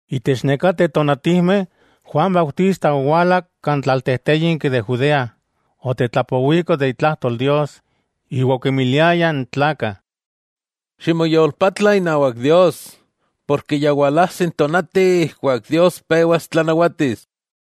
Itech nekateh tonatijmeh, Juan Bautista owala kan tlaltejtéyinki de Judea, otetlapowiko itlajtol Dios, iwa okimiliaya n tlakah: —Ximoyolpatla inawak Dios, ya walajsi n tonati ijkuak Dios pewas tlanawatis.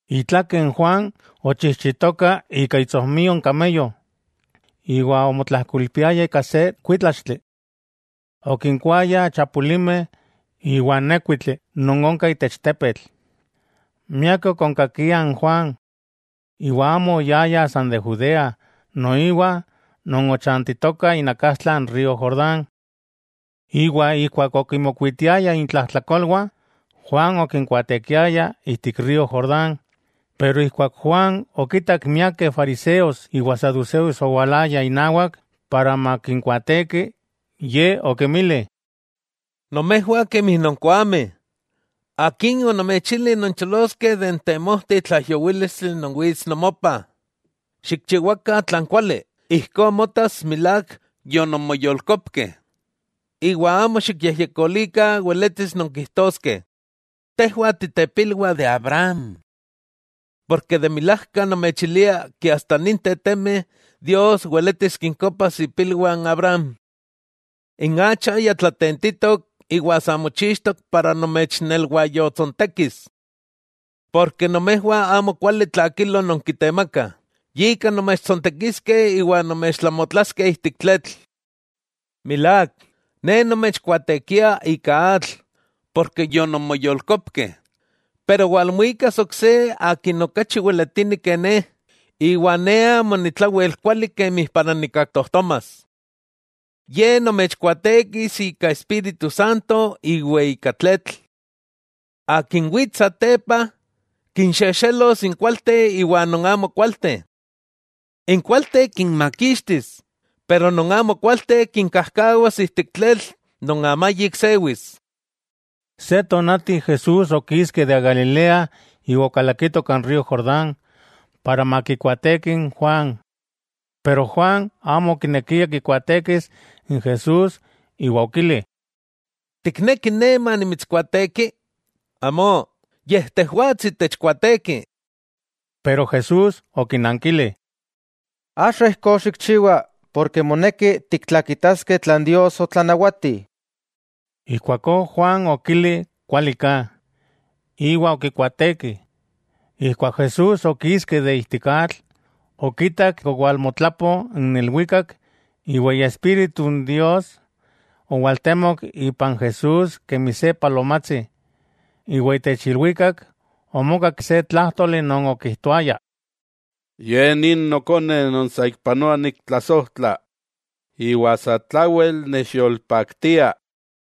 Itlakeh n Juan ochijchitoka ika itsojmio n kameyo, iwa omotlajkoilpiaya ika se kuítlaxtli. Okinkuaaya chapulimeh iwa nékuitli non onka itech tepetl. Miakeh okonkakiah n Juan. Iwa amo oyaya san de Judea, noiwa non ochajchantitokah inakastla n río Jordán. Iwa ijkuak okinmokuitiayah intlajtlakolwah, Juan okinkuaatekiaya ijtik río Jordán. Ijkuak Juan okitak miakeh fariseos iwa saduseos owalayah inawak makinkuaateki, ye okinmili: —¡Nomejwah kemi nonkoameh! ¡Akin onomechili noncholoskeh de n temojti tlaijyowílistli non wits nomopah! Xikchiwakah tlan kuali ijkó motas milák yononmoyolkopkeh. Iwa amo xikyejyekolikah weletis nonkijtoskeh: “Tejwah titepilwah de Abraham.” De milajka nomechilia asta ninteh temeh, Dios weletis kinkopas ipilwah n Abraham. N acha ya tlatentitok iwa sa mochixtok para nomechnelwayotsontekis. Porke nomejwah amo kuali tlakilo nonkitemakah, yika nomechtsontekiskeh iwa nomechtlamotlaskeh ijtik tletl. Milák, ne nomechkuaatekia ika atl porke yononmoyolkopkeh, pero walmuikas ok se Akin okachi weletini ke ne, iwa ne amo ni tlawel kuali para nikkaktojtomas. Ye nomechkuaatekis ika Espíritu Santo iwa ika tletl. Akin wits satepa, kinxexelos n kualteh iwa non amo kualteh. N kualteh kinmakixtis, pero non amo kualteh kinkajkawas ijtik tletl non amayik sewis. Se tonati Jesús okiski de Galilea iwa okalakito kan río Jordán, para makikuaateki n Juan. Pero Juan amo okinekia kikuaatekis n Jesús, iwa okili: —¿Tikneki ne manimitskuaateki? ¡Amó, yej tejwatsi techkuaateki! Pero Jesús okinankili: —Axa ijkó xikchiwa, moneki tiktlakitaskeh tlan Dios otlanawati. Ijkuakó Juan okili kualiká, iwa okikuaateki. Ijkuak Jesús okiski de ijtik atl, okitak owalmotlapo n ilwikak iwa Iespíritu n Dios owaltemok ipan Jesús kemi se palomatsi. Iwa itech ilwikak omokak se tlájtoli non okijtoaya: —Ye nin Nokone non saikpanoa niktlasojtla, iwa satlawel nechyolpaktia.